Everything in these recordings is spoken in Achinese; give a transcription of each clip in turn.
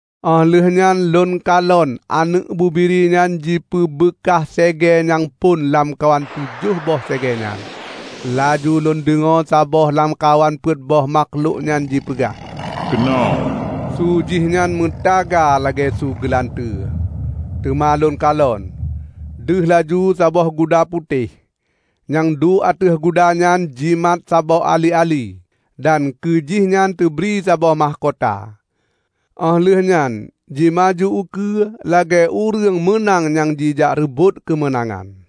Óh lheueh nyan lôn kalon Aneuëk Bubiri nyan jipeubeukah segée nyang phon lamkawan tujoh boh segée nyan. Laju lôn deungoe saboh lamkawan peuet boh makhlok nyan jipeugah, "Keunoe!" Su jihnyan meutaga lagée su geulanteue. Teuma lôn kalon, deuh laju saboh guda putéh. Nyang duek ateueh guda nyan jimat saboh ali-ali, dan keu jihnyan tebri saboh mahkota. Óh lheueh nyan jimaju ukeue lagée ureuëng meunang nyang jijak reubot keumeunangan.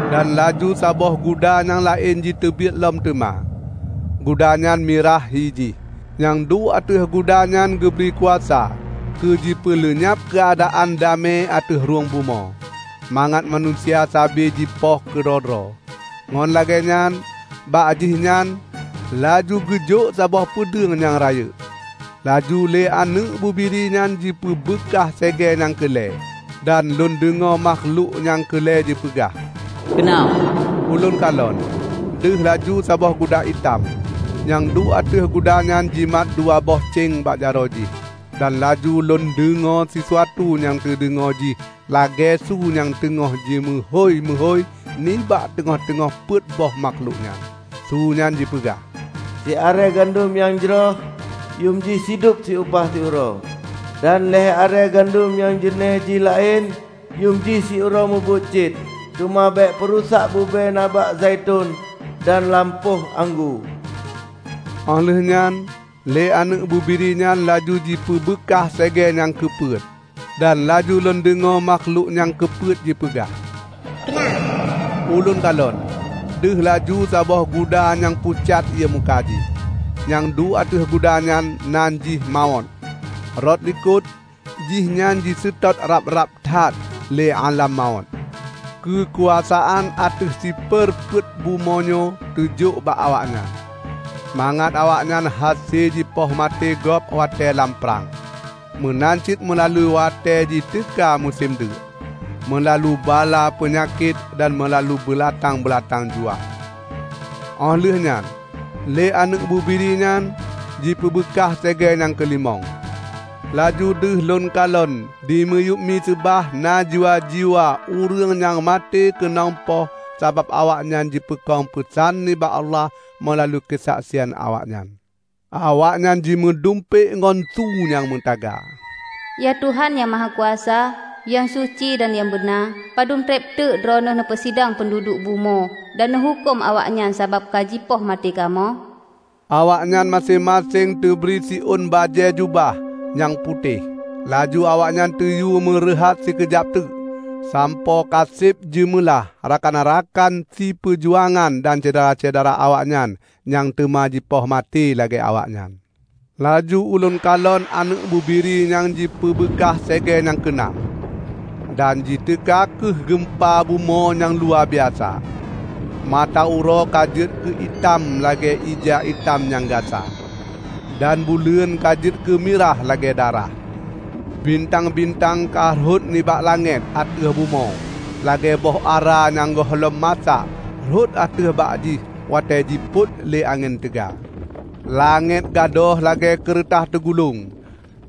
Dan laju saboh guda nyang laén jiteubiet lom teuma. Guda nyan mirah hi jih. Nyang duek ateueh guda nyan geubri kuasa keu jipeuleunyab keuadaan damé ateueh rhueng bumoe, mangat manusia sabe jipoh keudroe-droe. Ngon lagée nyan bak jihnyan laju geujok saboh peudeueng nyang rayeuk. Laju lé Aneuëk Bubiri nyan jipeubeukah segée nyang keu lhée. Dan lôn deungoe makhlok nyang keu lhée jipeugah, "Keunoe!" Ulôn kalon, deuh laju saboh guda itam. Nyang duek ateueh guda nyan jimat dua boh céng bak jaroe jih. Dan laju lôn deungoe sisuatu nyang teudeungoe jih lagée su nyang teungoh jimeuhôi-meuhôi nibak teungoh-teungoh peuet boh makhlok nyan. Su nyan jipeugah, "Siarée gandom nyang jroh yuem jih sidub upah siuroe, dan lhée arée gandom nyang jeunéh jih laén yuem jih siuroe mubuet cit. Teuma bék peurusak bube na bak zaiton dan lam poh anggô!" Óh lheueh nyan lé Aneuëk Bubiri nyan laju jipeubeukah segée nyang keu peuet. Dan laju lôn deungoe makhlok nyang keu peuet jipeugah, "Keunoe!" Ulôn kalon, deuh laju saboh guda nyang pucat ié muka jih. Nyang duek ateueh guda nyan nan jih Mawöt. Rot likot, jihnyan jiseutôt rab-rab that lé Álam Mawöt. Keukuasaan ateueh siper peuet bumoe nyoe teujok bak awaknyan, mangat awaknyan hase jipoh maté gob watée lam prang, meunan cit meulalu watée jiteuka musém deuk, meulalu bala peunyakét dan meulalu beulatang-beulatang juah. Óh lheueh nyan lé Aneuëk Bubiri nyan jipeubeukah segée nyang keu limong. Laju deuh lôn kalon dimiyueb miseubah na jiwa-jiwa ureuëng nyang maté keunong poh sabab awaknyan jipeukong peusan nibak Allah meulalu keusaksian awaknyan. Awaknyan jimeudumpék ngon su nyang meutaga, "Ya Tuhan Nyang Mahakuasa, nyang suci dan nyang beuna! Padub treb teuk Droeneueh neupeusidang peunduduek bumoe dan neuhuköm awaknyan sabab ka jipoh maté kamoe?" Awaknyan maséng-maséng teubri siôn bajée jubah nyang putéh. Laju awaknyan teuyue meureuhat sikeujab teuk, sampoe ka seb jeumeulah rakan-rakan siperjuangan dan syedara-syedara awaknyan nyang teuma jipoh maté lagée awaknyan. Laju ulôn kalon Aneuëk Bubiri nyan jipeubeukah segée nyang keu nam. Dan jiteuka kheueh geumpa bumoe nyang luwabiasa. Mata uroe ka jeuet keu itam lagée ija itam nyang gasa, dan buleuen ka jeuet keumirah lagée darah. Bintang-bintang ka rhot nibak langét ateueh bumoe lagée boh ara nyang gohlom masak rhot ateueh bak jih watée jipot lé angén teuga. Langét gadôh lagée keureutah teugulong,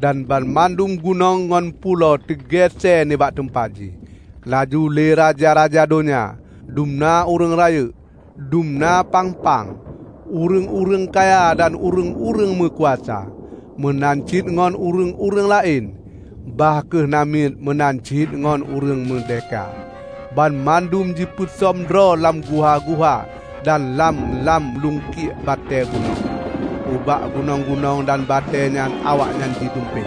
dan banmandum gunong ngon pulo teugesée nibak teumpat jih. Laju lé raja-raja donya, dum na ureuëng rayeuk, dum na pang-pang, ureuëng-ureuëng kaya dan ureuëng-ureuëng meukuasa, meunan cit ngon ureuëng-ureuëng laén, bah kheueh namiet meunan cit ngon ureuëng meurdehka, banmandum jipeusöm droe lam guha-guha dan lam-lam luengkiek batée gunong. Ubak gunong-gunong dan batée nyan awaknyan jidumpék,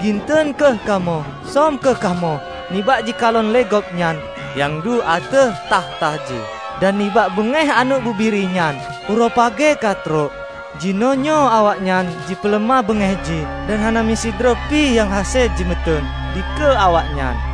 "Ginton kheueh kamoe! Som kheueh kamoe nibak jikalon lé Gobnyan nyang duek ateueh takhta jéh, dan nibak beungéh Aneuëk Bubiri nyan! Uroe pagée ka trok, jinoenyoe awaknyan jipeuleumah beungéh jih, dan hana meusidroe pih nyang hase jimeuteun dikeue awaknyan!"